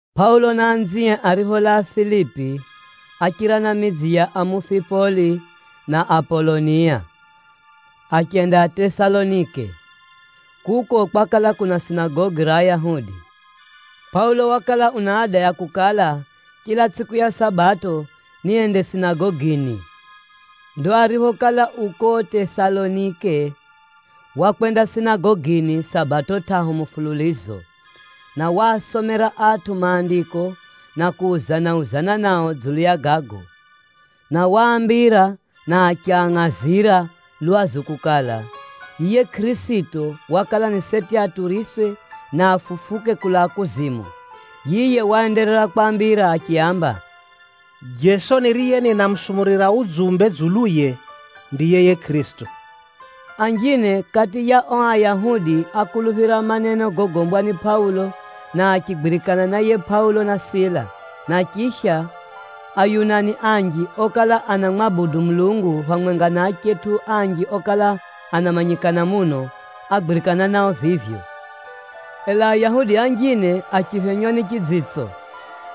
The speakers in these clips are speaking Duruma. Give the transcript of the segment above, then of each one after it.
Pʼaulo na anzie aripholaa Filipi, áchira na midzi ya Amufipoli na Apolonia, achenda Tesalonike. Kuko, kwakala kuna sinagogi ra Ayahudi. Pʼaulo wakala una ada ya kukala, chila tsʼiku ya Sabato, niende sinagogini. Ndo ariphokala u ko Tesalonike, wakwenda sinagogini Sabato tʼahu mufululizo, na waasomera atʼu Maandiko na kuuzana-uzana nao dzulu ya gago. Na waambira na achiangʼazira lwazu kukala, yiye Kʼirisito wakala ni seti aturiswe, na afufuke kulaa kuzimu. Yiye waenderera kwaambira achiaamba, “Jeso niriye ninamusumurira udzumbe dzuluye, ndiye yiye Kʼirisito.” Anjine kati ya o Ayahudi ákuluphira maneno gogombwa ni Pʼaulo, na achigwirikana na yiye Pʼaulo na Sila. Na chisha, Ayunani anji okala anamwabudu Mulungu phamwenga na achetʼu anji okala anamanyikana muno, ágwirikana nao vivyo. Ela Ayahudi anjine achiphenywa ni chidzitso.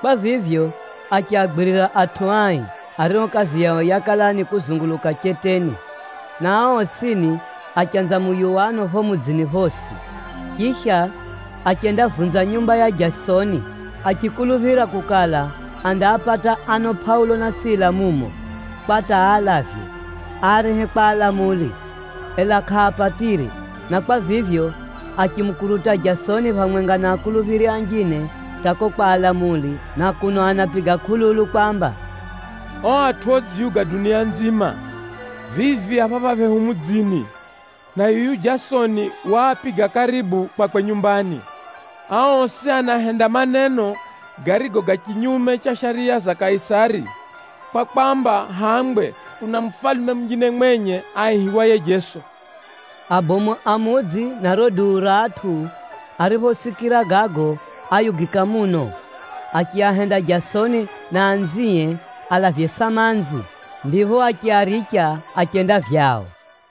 Kwa vivyo, achiagwirira atʼu ai, ario kazi yao yakala ni kuzunguluka cheteni, na ao osini achanza muyuwano pho mudzini phosi. Chisha, achendavunza nyumba ya Jasoni, achikuluphira kukala, andaapata ano Pʼaulo na Sila mumo, kwa hata aalavye, aarehe kwa alamuli. Ela kʼaapatire, na kwa vivyo, achimukuruta Jasoni phamwenga na akuluphiri anjine hata ko kwa alamuli na kuno anapiga kʼululu kwamba, “O atʼu odziyuga dunia nzima, vivi a phapha phehu mudzini, na yuyu Jasoni waapiga karibu kwakwe nyumbani. Ao osi anahenda maneno garigo ga chinyume cha shariya za Kaisari, kwa kwamba hangwe, kuna mufalume munjine mwenye aihiwaye Jeso.” Abomu a mudzi na riro duu ra atʼu ariphosikira gago, áyugika muno. Achiahenda Jasoni na anzie alavye samanzi, ndipho achiaricha achenda vyao.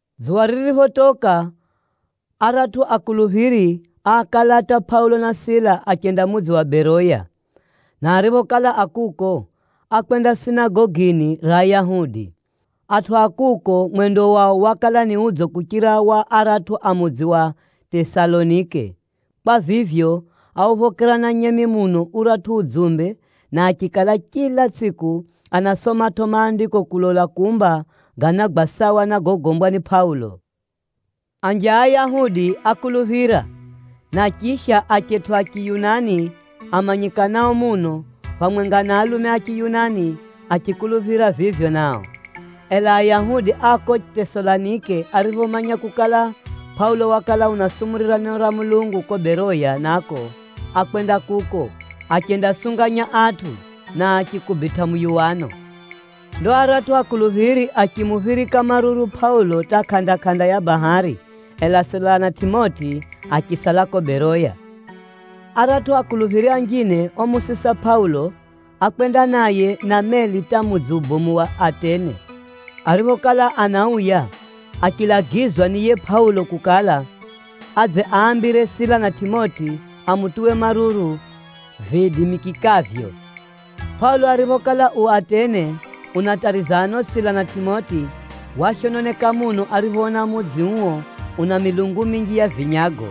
Dzuwa ririphotoka, aratʼu akuluphiri áakalata Pʼaulo na Sila achenda mudzi wa Beroya. Na ariphokala a kuko, ákwenda sinagogini ra Ayahudi. Atʼu a kuko mwendo wao wakala ni udzo kuchira wa aratʼu a mudzi wa Tesalonike. Kwa vivyo, áuphokera na nyemi muno uratʼu udzumbe, na achikala chila tsʼiku anasomatʼo Maandiko kulola kumba ganagwa sawa na gogombwa ni Pʼaulo. Anji a Ayahudi ákuluphira, na chisha achetʼu a Chiyunani amanyikanao muno, phamwenga na alume a Chiyunani, achikuluphira vivyo nao. Ela Ayahudi a ko Tesalonike ariphomanya kukala, Pʼaulo wakala unasumurira neno ra Mulungu ko Beroya nako, ákwenda kuko, achendasunganya atʼu, na achikubitʼa muyuwano. Ndo aratʼu akuluphiri achimuphirika maruru Pʼaulo hata kʼanda-kʼanda ya bahari, ela Sila na Tʼimoti achisala ko Beroya. Aratʼu akuluphiri anjine omusisa Pʼaulo, ákwenda naye na meli hata mudzi ubomu wa Atene. Ariphokala anauya, achilagizwa ni yiye Pʼaulo kukala, adze aambire Sila na Tʼimoti amutuwe maruru viidimikikavyo. Pʼaulo ariphokala u Atene unatariza ano Sila na Tʼimoti, washononeka muno ariphoona mudzi uo una milungu minji ya vinyago.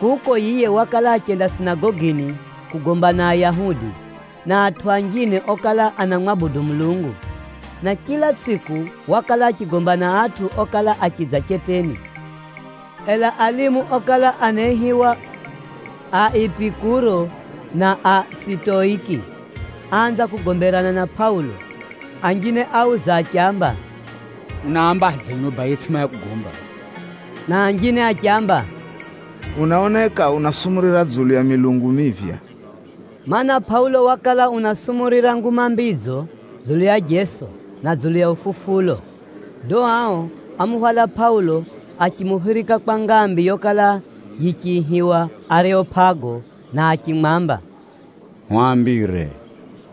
Kuko, yiye wakala achenda sinagogini kugomba na Ayahudi, na atʼu anjine okala anamwabudu Mulungu. Na chila tsʼiku wakala achigomba na atʼu okala achidza cheteni. Ela alimu okala anaihiwa a Epikuro na a Sitoiki achanza kugomberana na Pʼaulo. Anjine áuza achiamba, “Unaambadze yuno baye yetsʼimanya kugomba?” Na anjine achiamba, “Unaoneka unasumurira dzulu ya milungu miphya.” Maana, Pʼaulo wakala unasumurira Nguma Mbidzo dzulu ya Jeso, na dzulu ya ufufulo. Ndo ao ámuhwala Pʼaulo achimuphirika kwa ngambi yokala yichiihiwa Areopago, na achimwamba, “Hwambire,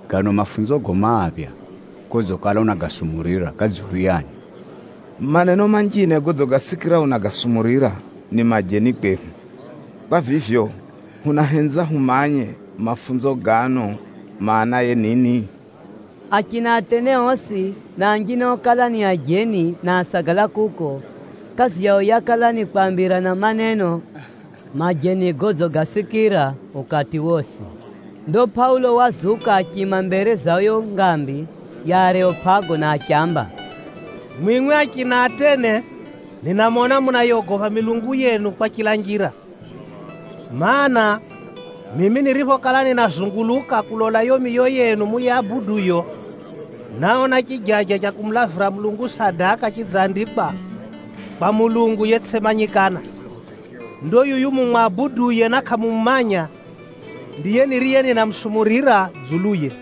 gano mafunzogo maphya godzikala unagasumurira ga dzulu yani? Maneno manjine godzigasikira unagasumurira, ni majeni kwehu. Kwa vivyo, hunahenza humanye, mafunzo gano maanaye nini?” Achina Atene osi, na anjine okala ni ajeni na ásagala kuko, kazi yao yakala ni kwambirana maneno majeni godzigasikira ukati wosi. Ndo Pʼaulo wazuka achiima mbere za yo ngambi ya Areopago na achiamba, “Mwimwi achina Atene ninamona munayogopha milungu yenu kwa chila njira. Maana, mimi niriphokala ninazunguluka kulola yo miyo yenu muyabuduyo, náona chijaja cha kumulavira Mulungu sadaka chidzandikwa, ‘Kwa mulungu yetsʼimanyikana.’ Ndo yuyu mumwabuduye na kʼamumumanya, ndiye niriye ninamusumurira dzuluye.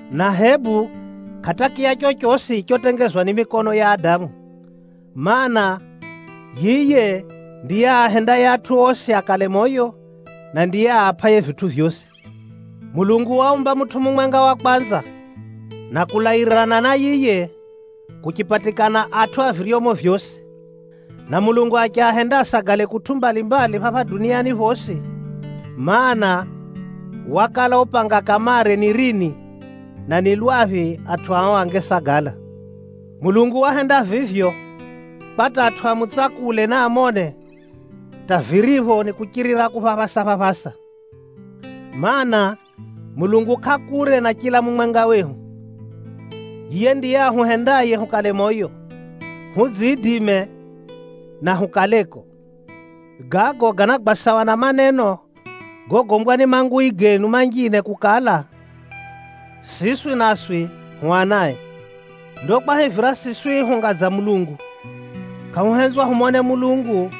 Na hebu kʼatakiya chochosi chotengezwa ni mikono ya adamu. Maana, yiye ndiye aahendaye atʼu osi akale moyo, na ndiye aapʼaye vitʼu vyosi. Mulungu waumba mutʼu mumwenga wa kwanza, na kulairirana na yiye, kuchipatikana atʼu a viryomo vyosi. Na Mulungu achiahenda asagale kutʼu mbalimbali phapha duniani phosi, mana, wakala upanga kamare ni rini, na ni lwaphi atʼu ao angesagala. Mulungu wahenda vivyo kwa hata atʼu amutsakule, na amone, hata viripho ni kuchirira kuphaphasa-phaphasa. Maana, Mulungu kʼa kure na chila mumwenga wehu. Yiye ndiye ahuhendaye hukale moyo, hudziidime na hukaleko. Gago ganagwa sawa na maneno gogombwa ni mangui genu manjine kukala, ‘Siswi naswi hu anae.’ “Ndo kwahivira siswi hunga dza Mulungu, kʼahuhenzwa humone Mulungu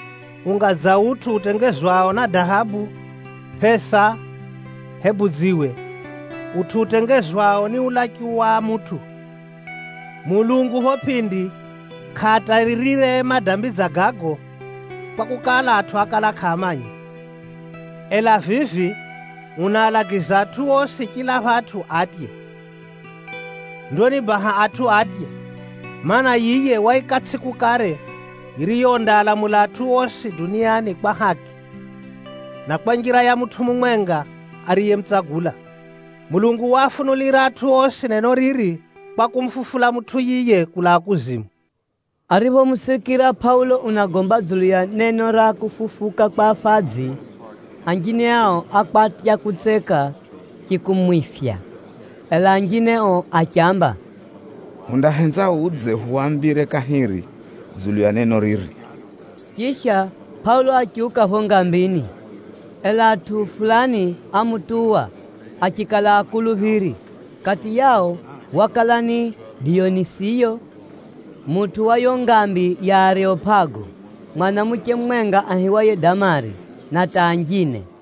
unga dza utʼu utengezwao na dahabu, pʼesa hebu dziwe, utʼu utengezwao ni ulachu wa mutʼu. Mulungu pho pʼindi kʼaataririre madambi dza gago, kwakukala, atʼu ákala kʼaamanya. Ela vivi unaalagiza atʼu osi chila phatʼu atye. Ndo ni baha atʼu atye, mana, yiye waika tsʼiku kare yiriyo undaalamula atʼu osi duniani kwa haki, na kwa njira ya mutʼu mumwenga ariyemutsagula. Mulungu waafunulira atʼu osi neno riri, kwa kumufufula mutʼu yiye kulaa kuzimu.” Ariphomusikira Pʼaulo unagomba dzulu ya neno ra kufufuka kwa afadzi, anjine ao ákwatya kutseka chikumwifya. Ela anjine o achiamba, “Hundahenza udze uhwambire kahiri dzulu ya neno riri.” Chisha, Pʼaulo achiuka pho ngambini. Ela atʼu fulani ámutuwa, achikala akuluphiri. Kati yao wakala ni Diyonisiyo, mutʼu wa yo ngambi ya Areopago, mwanamuche mumwenga aihiwaye Damari, na hata anjine.